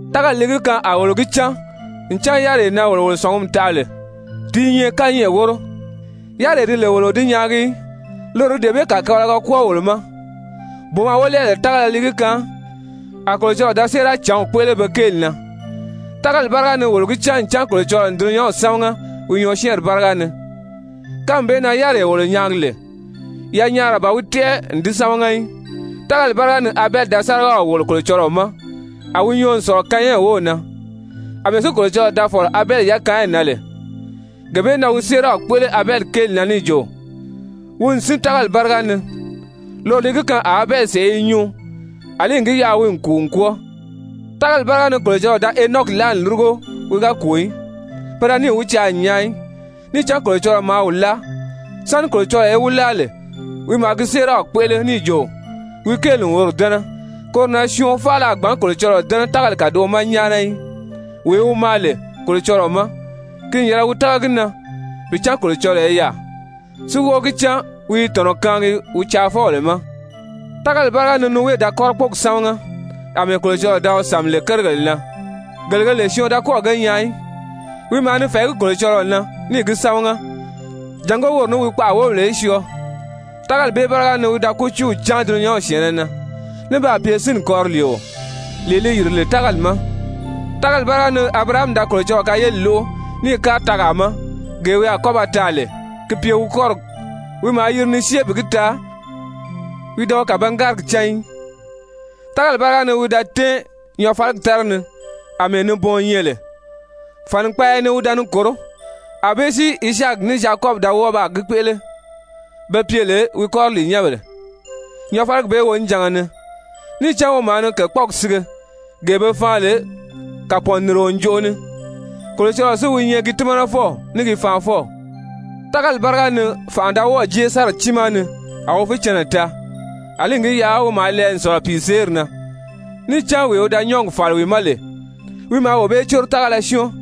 Tágali li gi kaan a wolo gi cán ncan yáriree na wolo wolo sɔ̀ngumi taʔa lè, ti i nyɛ kányɛʔɛ wóro, yáriree di lè wolo o di nyaagi í, loro li dee bee kàkabalaga kwɔ́ɔ wolo ma. Booma wolɛɛbèle tágala li gi kaan a Kolocɔlɔɔ da séeracǎnw kpéʔele be kéeli na. Tágali báriga ni wolo gi cán ncan Kolocɔlɔɔ n dulunyanw sámaga wi nyɔɔsyɛɛnri báriga ni, kánmi bee na yáriree wolo nyaagi lè, yanyaara ban wi tɛ́ʔɛ n di sámaga í. Tágali báriga ni Abɛli da sárigaw wòlo Kolocɔlɔɔ ma, a wi nyɔɔ n sɔ̀lɔ Kayɛn wów na. Amɛɛ si Kolocɔlɔɔ da fɔ̀lɔ Abɛli yakaanyi na lè, gee bee na wi séeraw kpéʔele Abɛli kéeli na níì jo wi n sín tágali báriga ni. Loro li gi kaan a Abɛli sèʔé i nyuu àlí n gi yaʔa wi n kùu n kwɔ́ɔ. Tágali báriga ni Kolocɔlɔɔ da Henɔki láa n lúrugo, wi ga kùu í. Pe da níì wi caa n nyaa í, níì cán Kolocɔlɔɔ maa wi láa. Sáni Kolocɔlɔɔ í wi láa lè, wi maa gi séeraw kpéʔele níì jo wi kéeli n woro dɛ́nɛ. Koro na syɔɔn faala a gbǎn Kolocɔlɔɔ dɛ́nɛ tágali kàdoʔo ma nyáana í. Wee wi maa lè Kolocɔlɔɔ ma, ki n yɛlɛ wi tága gi na bi cán Kolocɔlɔɔ i yaà, si wɔ́ɔ̀ gi cán wi i tɔ̀nɔ kaangi wi caafɔbèle ma. Tágali báriga ni Nowe da kɔ́rɔkpɔɔgi sámaga, àmɛɛ Kolocɔlɔɔ da wi sàmi lè kérigèle na, gele ge lè syɔɔn da kɔ́ɔ̀ ge nyaa í, wi maa ni fɛ̀ɛgí Kolocɔlɔɔ na níì gi sámaga jàngó woro ní wi kpaʔa wóbèle í syɔɔ. Tágali bee báriga ni wi da kútiiw cáan dulunyanw syɛ̀ɛnnɛ na, ní baa pye sínni kɔriliio lee li yìri lè tágali ma. Tágali báriga ni Abirahami da Kolocɔlɔɔ kayeli lóʔo níì kári tɛɛgaa ma, gee wi a kɔ́ ba taa lè gi pye wi kɔ́rigi. Wi maa yiri ni syée bi gi taa wi da wi kàbangárigi cán í. Tágali báriga ni wi da tɛ́ɛn nyɔɔfaligi tára ni àmɛɛ nibɔɔn nyɛ lè, fànikpaaya ni wi da ni kòró, ànbée si Izaaki ní Zyakɔbi da wɔ́ɔ baa gi kpéʔele, be pye lè wi kɔriliinyɛnbèle nyɔɔfaligi bee wonijanga ni. Níì cán wi maa ni kèkpɔɔgi sige, gee be faan lè kàpɔɔnnirio ǹjoʔo ni, Kolocɔlɔɔ si wi nyɛ gi tímanafɔw ní gi faanfɔw. Tágali báriga ni fànʔa da wɔ́ɔ̀ jée Sara tiimaa ni a wi fícɛnnɛ taa, àlí n gi yaʔa wi maa lɛɛ n sɔ̀lɔ pìiseeri na, níì cán wee wi da nyɔ́ɔgi fàli wi ma lè, wi maa wee bee córo tágala syɔ́ɔn.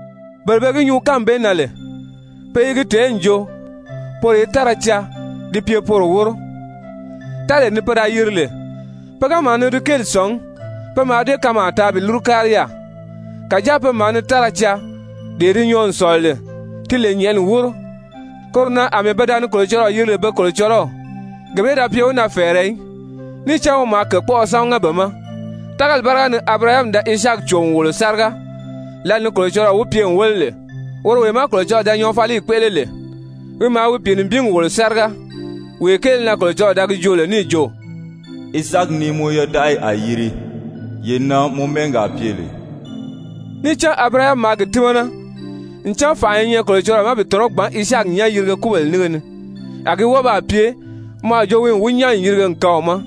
Bele be gi nyuu kánmi bee na lè, pe i gi tèé n jo poro i táraa caa ti pye poro wóro. Táree ni pe da yiri lè, pe ga maa ni di kéeli sɔ̀ngí, pe mǎà dée kanmaa taa bi lúru kári yaà. Kàjáa pe maa ni táraa caa, dee di nyɔɔ n sɔ̀lɔ lè, ti lè nyɛ̀ʔɛni wóro. Koro na àmɛɛ pe da ni Kolocɔlɔɔ yiri lè be Kolocɔlɔw, gee bee da pye wi na fɛ̀ɛrɛ í. Níì cán wi maa kèkpɔʔɔ sámaga be ma. Tágali báriga ni Abirahami da Izaaki cò n wòlo sáriga, lǎli ni Kolocɔlɔɔ wi pye n wéle lè. Woro wee má Kolocɔlɔɔ da nyɔɔfaliyi kpéʔele lè, wi maa wi pìinibingi wòlo sáriga, wee kéele na Kolocɔlɔɔ da gi joo lè níì jo: «Izaaki ni mɔ yodaʔayi a yiri, yee na mɔ mɛ́ɛgi a pye lè.» Níì cán Abirahami maa gi tímana ncan fànʔa i nyɛ Kolocɔlɔɔ ma bi tɔ̀nɔ́ gbǎn Izaaki nyán yirige kúbèle nínge ni. A gi wɔ́ɔ baa pye mɔ a jo wi n wi nyán n yirige n kaan wi ma.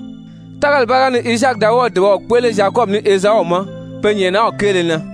Tágali báriga ni Izaaki da wɔ́ɔ̀ dùbaw kpéʔele Zyakɔbi ní Ezau ma pe nyɛ̀ʔɛnaw kéele na.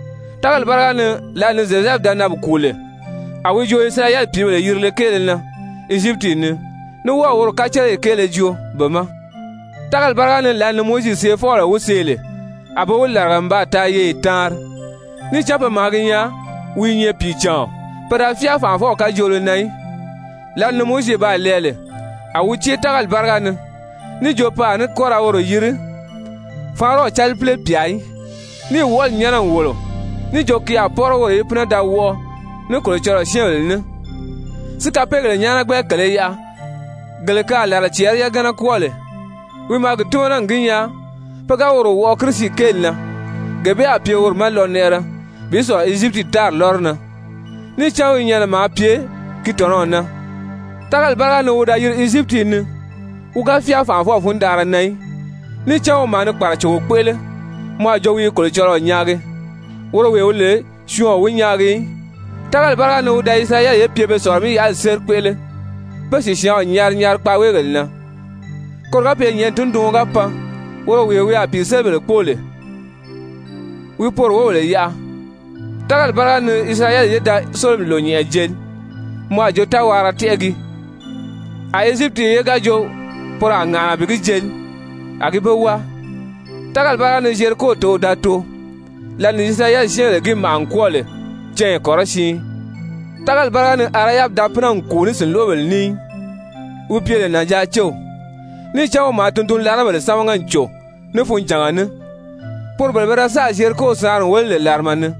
Tágali báriga ni, lǎli ni Zyozɛfu da nan bi kùu lè, a wi jo Isirayɛli pìíbèle yirile kéele na, Ezyipiti ni, ní wɔ́ɔ̀ woro kaceleyi kéele joo be ma. Tágali báriga ni, lǎli ni Mowizi seefɔbèle wi see lè, a be wi làriga n baa taa yeye taanri, níì cán pe maa gi nyaa wi i nyɛ pìicàɔn. Pe da fyáa fànʔafɔw kajoolo na í. Lǎli ni Mowizi baa lɛɛ lè, a wi cée tágali báriga ni níì jo pe a ní kɔ́ ra woro yiri Faraɔnw calipile pyà í níì wɔʔɔli nyɛ́nɛ n wòlo níì jo ki a pɔ́rɔ woro í pínɛ da wɔʔɔ ní Kolocɔlɔɔ syɛ́ɛnbèle ní si kapeegèle nyáanagbɛ kèlē yaʔa gele ke a làla cɛɛri yagana kwɔ́ɔ lè. Wi maa gi tímana n gi nyaa pe ga woro wɔʔɔ Kirisi kéeli na, gee bee a pye woro ma lɔnɛʔɛrɛ bi sɔ̀lɔ Ezyipiti tári lɔ́rɔ na. Níì cán wi nyɛnɛ maa pye gi tɔ̀nɔw na. Tágali báriga ni wi da yiri Ezyipiti ni, wi ga fyáa fànʔafɔw fundanʔara na í. Níì cán wi maa ni kpàracogo kpéʔele, mɔ a jo wi i Kolocɔlɔɔ nyaagi, woro wee wi lè syɔɔn o wi nyaagi í. Tágali báriga ni wi da Isirayɛli ye pye be Sɔ̀lɔ-mí-yaʔali séri kpéʔele, bé sìsyaanw nyari nyari kpaaweegèle na, koro ga pye nyɛ̀ʔɛni tunduɔn ga pan woro wee wi a pìiselibèle kpóo lè, wi poro wóbèle yaʔa. Tágali báriga ni Isirayɛli ye da Sólomi Lònyɛnʔɛ jeli mɔ a jo táwaara tɛ́ʔɛ gii, a Ezyipiti ye ga jo poro a ŋàʔana bi gi jeli, a gi be wáa. Tágali báriga ni Zyeriko tǒw da too, lǎli ni Isirayɛli syɛ́ɛnbèle gi màʔa n kwɔ́ɔ lè cányi kɔrɔsiin. Tágali báriga ni Arahabi da pínɛ n kùu ní sìnloʔobèle ní í, wi pye lè nànjaacew, níì cán wi maa tundunlarabèle sámaga n cò ní funjànga ní, poro bele pe da sáà Zyeriko saanri n wéle lè làrama ni.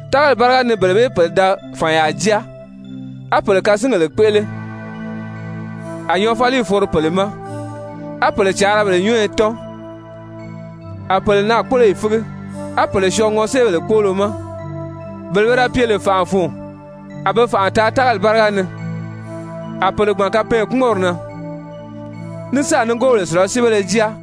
Tágali báriga ni bele bee pèle da fànyaa jáa, á pèle kasingèle kpéʔele, a nyɔɔfaliyi foro pèle ma, á pèle càarabèle nyɔ́ɔyɔ tɔ́n, a pèle naakpoloyi fígi, á pèle syɔɔ ŋɔséebèle kpóolo ma, bele pe da pye lè fànʔa fun, a be fànʔa taa tágali báriga ni, a pèle gbàn kapɛɛnkpumɔnri na, ní sáà nigoobèle sùlasiibéle jáa.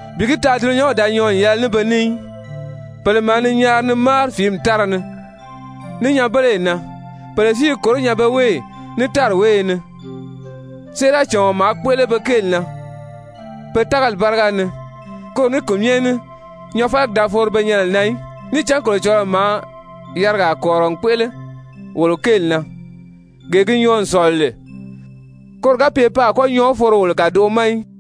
bi gi taa dulunyanw da nyɔɔ n yɛlɛ ní be ní í! Pèle maa ni nyaari ni máari fìími tára ni, ní nyanbeleyi na, pèle si i kòró nyanbeweeyi, ní tári wéeye ni. Séeracàɔn maa kpéʔele be kéeli na pe tágali báriga ni, koro ní ki myɛ ní nyɔɔfaligi da foro be nyɛnɛ na í. Níì cán Kolocɔlɔɔ maa yarigaa kɔ̀rirɔ n kpéʔele wolo kéeli na, gee gi nyɔɔ n sɔ̀lɔ lè, koro ga pye pe a kɔ́ nyɔɔ foro wolo kàdoʔo ma í.